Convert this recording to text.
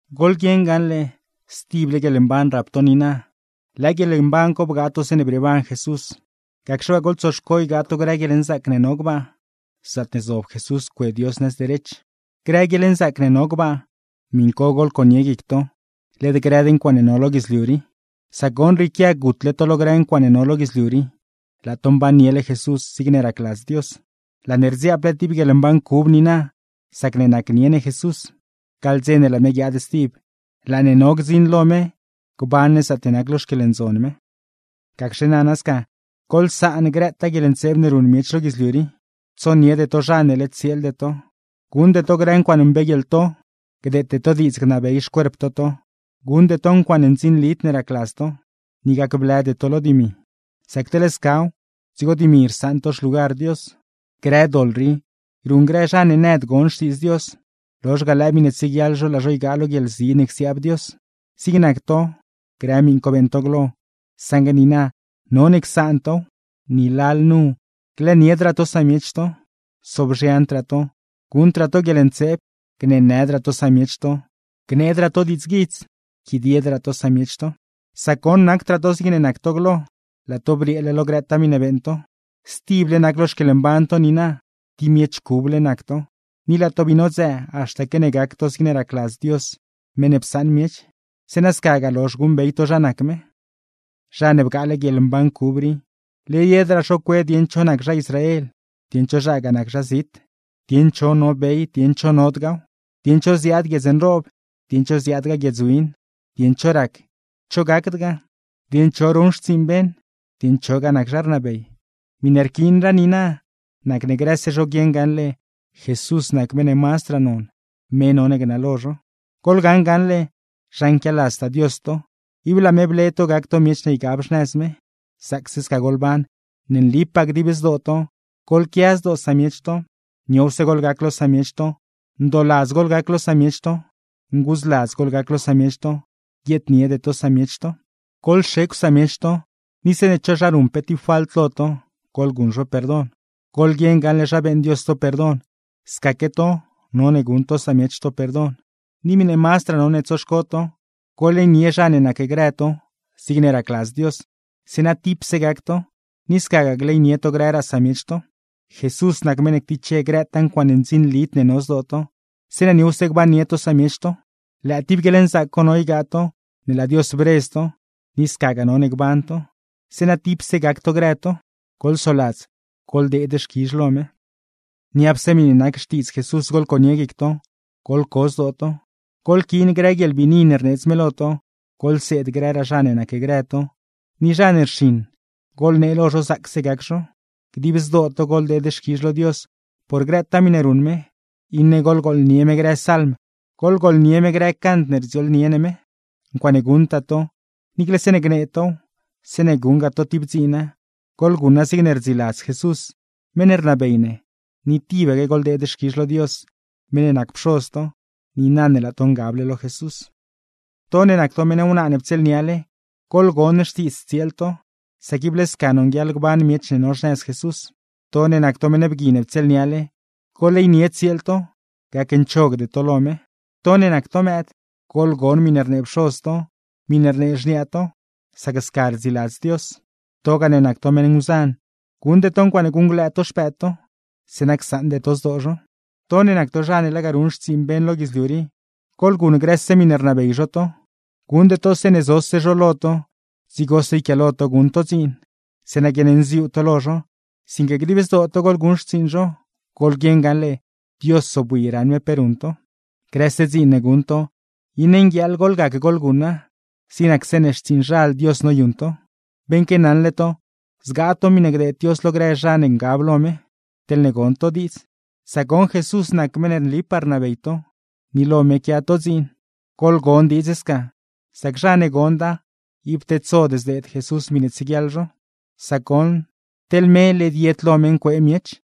Goḻguieṉ gaṉle, stible guieḻmban rap to niina, lëë guieḻmban co bgaa to zeeṉe brieeban Jesús; gacxe waa, goḻtsoxco ygaa to grë guieḻnzaac ne no gbaa, zaatne zob Jesús cue Dios nëz derech. Grë guieḻnzaac ne no gbaa miṉ co goḻconie guic to, led grëd ncuaaṉe no lo guidzliu rii; sac goṉ, rrieequia gutle to lo grë ncuaaṉe no lo guidzliu rii, laa to mbanniele Jesús, zigne racladz Dios. Laa ne rdziaap tib guieḻmban cub niina, sacne nacnie ne Jesús; gaḻ dze ne laa me guiaad stib, laa ne no gdziṉ lo me gban ne zaatne nac lo xquieḻndzon me. Gacxe nana sca, goḻsaan grëtaa guieḻntseeb ne ruṉ miech lo guidzliu rii: tsoniede to zha ne led tsieelde to, guṉde to grë ncuaaṉe mbeeguieḻto, gdeete to diidz gnabey xcuerp to to, guṉde to ncuaaṉe ndzinlid ne racladz to, ni gacblëde to lo dimi (sac teḻ scaw, dzigo dimi rsaṉ to xlugar Dios). Grë doḻ rii ruṉ grë zha ne nëd gon xtiidz Dios, lozh ga lëë miṉe tsieguiaḻ zho laa zho ygaa lo guieḻzi ne csiaab Dios. Zig nac to, grë miṉ co beeṉ to glo; saṉgue niina, none csaan tow, ni lalnu: glëëniedraa to samiech to, sobzhiandraa to, guṉdraa to guieḻntseeb, gneenëdraa to samiech to, gneedraa to diidzguidz, yquidiedraa to samiech to. Sac goṉ, nacdraa to zigne nac to glo, laa to brieele lo grëtaa miṉe beeṉ to. Stible nac lo xquieḻmban to niina: tib miech cuble nac to, ni laa to bii nodzëë haxta que ne gac to zigne racladz Dios meṉ ne psaṉ miech, zeeṉa scagaa lozh guṉbey to zha nac me. Zha ne bgaale guieḻmban cub rii, led yedraa zho cue dieṉ cho zha nac zha Israel, dieṉ cho zhagaa nac zha zit; dieṉ cho no bey, dieṉ cho nodgaaw; dieṉ cho ziaad guiedz nroob, dieṉ cho ziaadgaa guiedz win; dieṉ cho rac, cho gacdgaa; dieṉ cho ruṉ xtsiiṉ beṉ, dieṉ chogaa nac zha rnabey. Miṉe rquiinraa niina, nacne grëse zho guieṉ gaṉle Jesús nac meṉ ne mazdraa non, me none gnalo zho. Goḻgaṉ gaṉle, zha nquialadztaa Dios to, ib laa me ble to gac to miech ne ygab xnëz me. Zaacse sca goḻban, ne nlipaa dib zdoo to: goḻquia zdoo samiech to, niowse goḻgac lo samiech to, ndooladz goḻgac lo samiech to, nguudzladz goḻgac lo samiech to, guieedniede to samiech to. Guieedniede to samiech to, ni zeeṉe cho zha ruṉ pe tib falt lo to, goḻguṉ zho perdon. Goḻguieṉ gaṉle zha beeṉ Dios to perdon; scaque to, none guṉ to samiech to perdon. Ni miṉe mazdraa none tsoxco to, goḻleynie zha ne nacgrë to zigne racladz Dios, zeeṉa tipse gac to; ni scagaa gleynie to grëraa samiech to. Jesús nac meṉ ne ctiche grëtaa ncuaaṉe ndzinlid ne no zdoo to, zeeṉa niowse gbannie to samiech to. Lëë tib guieḻnzaac co no ygaa to ne laa Dios bredz to, ni scagaa none gban to, zeeṉa tipse gac to grë to. Goḻsoladz goḻdeed xquizh lo me. Niapse miṉe nac Xtiidz Jesús goḻconie guic to, goḻco zdoo to. Goḻquiin grë guieḻbiini ne rneedz me lo to, goḻseed grë zha ne nacgrë to, ni zha ne rxiṉ, goḻnee lo zho zaacse gac zho. Dib zdoo to goḻdeed xquizh lo Dios por grëtaa miṉe ruṉ me, iṉe goḻgooḻnie me grë salm, goḻgooḻnie me grë cant ne rdziooḻnie ne me. Ncuaaṉe guṉtaa to, niicle zeeṉe gnee tow, zeeṉe guṉgaa to tib dziina, goḻguṉa zigne rdziladz Jesús, meṉ ne rnabey ne; ni tibaque goḻdeed xquizh lo Dios meṉ ne nac Pxoz to, niina ne laa to ngable lo Jesús. To ne nac to meṉ wnaa ne ptsieelniale, goḻgon xtiidz tsieel to, sac ible sca nonguieḻ gban miech ne no xnëz Jesús. To ne nac to meṉ bgui ne ptsieelniale, goḻleynie tsieel to; gacnchogde to lo me. To ne nac to mëëd, goḻgon miṉe rnee pxoz to, miṉe rnee xniaa to, sac sca rdziladz Dios. Togaa ne nac to meṉ nguzan, guṉde to ncuaaṉe guṉglëë to xpëëd to, zeeṉa csaṉde to zdoo zho. To ne nac to zha ne lega ruṉ xtsiiṉ beṉ lo guidzliu rii, goḻguṉ grëse miṉe rnabey zho to; guṉde to zeeṉe zose zho lo to dzigose yquiaalo to guṉ to dziin, zeeṉa guiaṉnziuu to lo zho; sinque dib zdoo to goḻguṉ xtsiiṉ zho, goḻguieṉ gaṉle Dios zobwi raṉ me pe ruṉ to. Grëse dziin ne guṉ to, iṉe nguieeḻ goḻgac goḻguṉa, zig nac zeeṉe xtsiiṉzhal Dios noyuṉ to. Beṉque naṉle to, zgaa to miṉe gdeed Dios lo grë zha ne ngab lo me, teḻne gon to diidz; sac goṉ Jesús nac meṉ ne nlipaa rnabey to, ni lo me quia to dziin. Goḻgon diidz sca, sac zha ne gonda, ib tedsod zdeed Jesús miṉe tsieguiaḻ zho; sac goṉ, teḻ me led yed lo me ncuee miech.